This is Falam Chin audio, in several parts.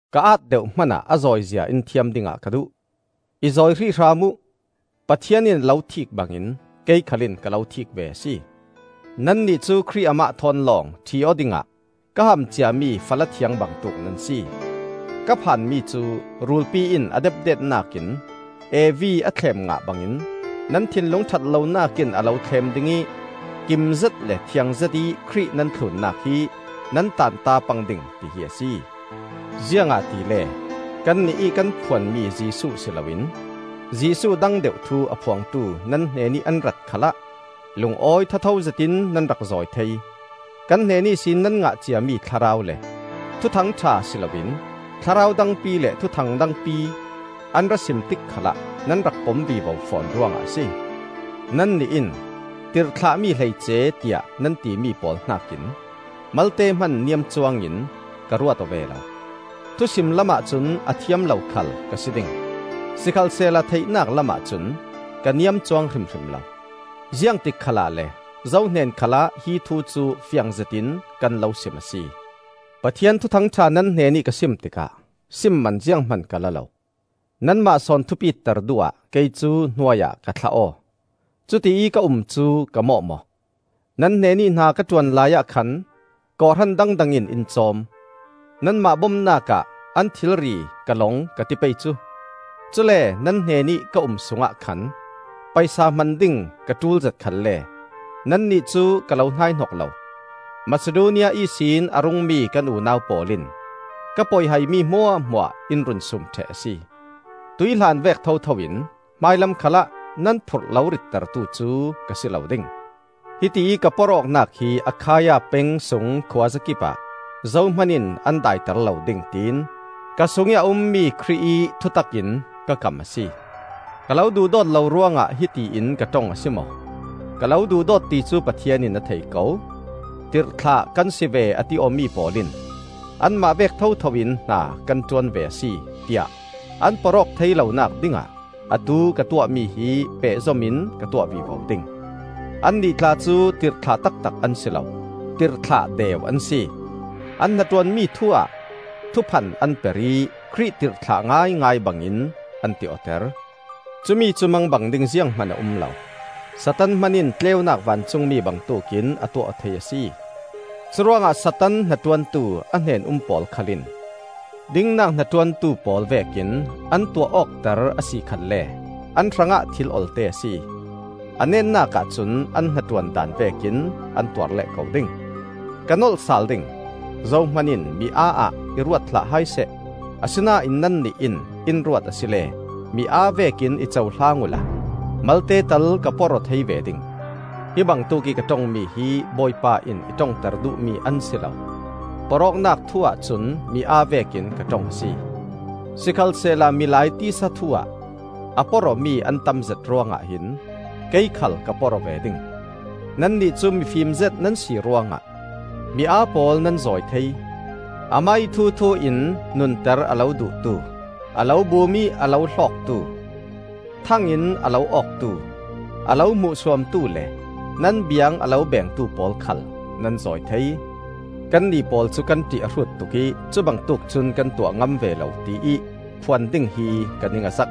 Ka aat deuh hmanah a zawizia in thiam dingah ka duh! I zawi hrih hram uh! Pathian in a lo thiik bangin kei khal in ka lo thiik ve a si. Nannih cu Khrih amah thawn lawng ṭhi-aw dingah ka ham ciami fala thiang bangtuk nan si. Ka phan mi cu: rulpi in a depdetnak in Evi a thlem ngah bangin nan thinlung ṭhat lonak in a lo thlem ding ih kimzet le thiang zetih Khrih nan thlunnak hi nan tanta pang ding tihi a si. Ziangahtile kannih ih kan phuanmi Jesuh si loin Jesuh dang deuh thu a phuangtu nan hnenih an rat khalah lungawi thatho zetin nan rak zawi thei. Kan hnen ihsin nan ngah ciami Thlarau le Thuthang ṭha si loin thlarau dangpi le thuthang dangpi an ra sim tik khalah nan rak pom vivo fawn ruangah a si. Nannih in, “Tirhthlahmi hleice” tiah nan timi pawl hnakin malte hman niam cuangin ka ruat aw ve lo. Thusim lamah cun a thiam lo khal ka si ding; sikhalsehla theihnak lamah cun ka niam cuang hrimhrim lo. Ziangtik khalah le zo hnen khalah hi thu cu fiang zetin kan lo sim a si. Pathian Thuthang ṭha nan hnenih ka sim tikah sim man zianghman ka la lo. Nanmah sawn thupitter duh ah kei cu hnuai ah ka thla aw. Cutiih ka um cu ka mawh maw? Nan hnenih hna ka ṭuan laiah khan kawhhran dangdang in in cawm. Nanmah bomnak ah an thilri ka long ka ti pei cu! Cule nan hnenih ka um sungah khan paisa hman ding ka ṭulzet khalle nannih cu ka lo hnaihnok lo; Masidonia ihsin a rungmi kan unau pawl in ka poihaimi hmuahhmuah in run suum ṭheh a si. Tuihhlan vek thothoin hmailam khalah nan phurh lo rittertu cu ka si lo ding. Hitiih ka porh awknak hi Akhaia peng sung khuazakip ah zohman in an daiter lo ding tiin ka sungih a ummi Khrih ih thutak in ka kam a si. Ka lo duhdawt lo ruangah hiti in ka ṭong a si maw? Ka lo duhdawt ti cu Pathian in a thei ko. Tirhthlah kan si ve a ti awmi pawl in, “Anmah vek thothoin hna kan ṭuan ve a si,” tiah an porh awk thei lonak dingah atu ka tuahmi hi pehzom in ka tuah vivo ding. Annih tla cu tirhthlah taktak an si lo, tirhthlah deu an si. An hnaṭuanmi thu-ah thuphan an per ih Khrih tirhthlah ngaingai bangin an ti awter. Cumi cu mangbang ding zianghman a um lo; Satan hmanin tleunak vancungmi bangtuk in a tuah aw thei a si. Curuangah Satan hnaṭuantu a hnen-um pawl khal in dingnak hnaṭuantu pawl vekin an tuah awkter a si khalle an hrangah thil olte a si. A netnak ahcun an hnaṭuan daan vekin an tuar leh ko ding. Ka nolh sal ding: zohman in miaa ah i ruat hlah hai seh. Asinain nannih in in ruat asile mi aa vekin i cohlang uhla malte tal ka porh aw thei ve ding. Hi bangtuk ih ka ṭongmi hi Bawipa in i ṭongter duhmi an si lo; porh awknak thu-ah cun mi aa vekin ka ṭong a si. Sikhalsehla milai tisa thu-ah a porh awmi an tamzet ruangah hin kei khal ka porh aw ve ding. Nannih cu mifim zet nan si ruangah mi aa pawl nan zawi thei! Amah ih thuthu in nunter a lo duhtu, a lo bum ih a lo hlawktu, thang in a lo awktu, a lo hmuhsuamtu le nan biang a lo bengtu pawl khal nan zawi thei! Kannih pawl cu kan ṭih a hrut tuk ih cubangtuk cun kan tuah ngam ve lo tiih phuan ding hi ka ning a zak.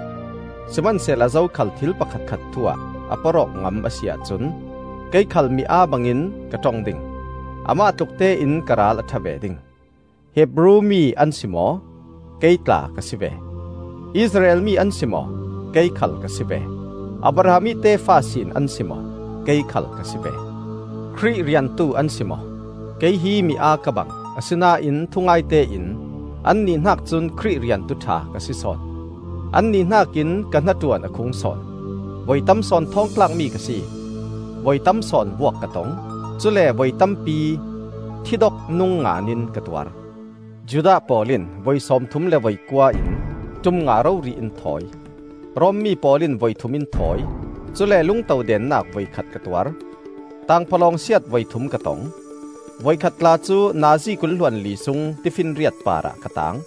Sihmansehla zokhal thil pakhatkhat thu-ah a porh awk ngam a si ahcun, kei khal mi aa bangin ka ṭong ding, amah tluk tein ka ral a ṭha ve ding. Hebru mi an si maw? Kei tla ka si ve. Israel mi an si maw? Kei khal ka si ve. Abraham ih tefa sin an si maw? Kei khal ka si ve. Khrih riantu an si maw? Kei hi miaa ka bang, asinain thungaite in annih hnak cun Khrih riantu ṭha ka si sawn. Annih hnakin ka hnaṭuan a khung sawn; voi tam sawn thawng thlakmi ka si; voi tamsawn vuak ka tong, cule voi tampi thi dok nungngaan in ka tuar. Judah pawl in voi sawmthum le voikua in ṭum nga rori in thawi. Rom mi pawl in voithum in thawi, cule lungto dennak voikhat ka tuar. Tangphawlawng siat voithum ka tong, voikhat tla cu nazi kul hluanli sung tifinriat parah ka taang.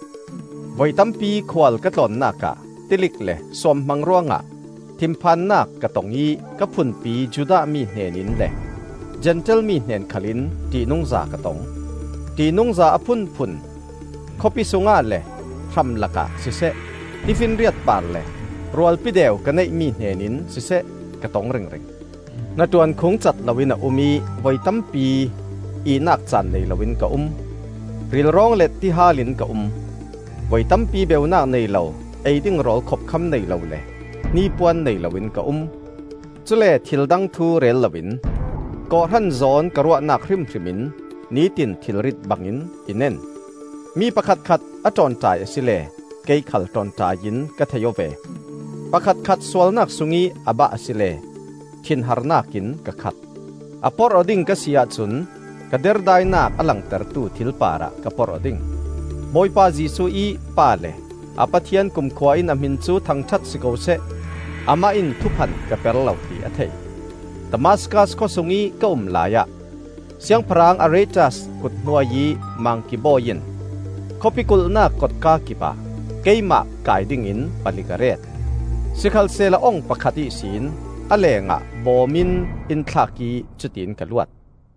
Voi tampi khual ka tlawnnak ah tilik le suamhmang ruangah thinphannak ka tong ih ka phunpi Judah mi hnen in le Zentail mi hnen khalin ṭihnungza ka tong. Ṭihnungza a phunphun khawpi sungah le hramlakah siseh, tifinriat parah le rualpi deu ka neihmi hnenin siseh ka tong ringring. Hnaṭuan khung cat loin a um ih voi tampi ihnak caan nei loin ka um; rilrawng le tihal in ka um; voi tampi beunak nei lo, ei ding rawl khopkham nei lo le hnipuan nei loin ka um. Cule thildang thu rel loin kawhhran zawn ka ruahnak hrimhrim in nitin thilrit bangin i nen. Mi pakhatkhat a ṭawnṭai asile kei khal ṭawnṭai in ka thei aw ve; pakhatkhat sualnak sungih a bah asile thinharnak in ka khat. A porh aw ding ka si ahcun ka derdainak a langtertu thil parah ka porh aw ding. Bawipa Jesuh ih Pa le a Pathian kumkhua in a hmin cu thangṭhat si ko seh; Amah in thuphan ka per lo ti a thei. Damaskas khawsungih ka um laiah Siangpahrang Aretas kuthnuai ih mangki bawi in khawpi kulhnak kotka kipah keimah kai dingin palik a ret. Sikhalsehla ong pakhat ihsin a lengah bawm in in thlak ih cutin ka luat.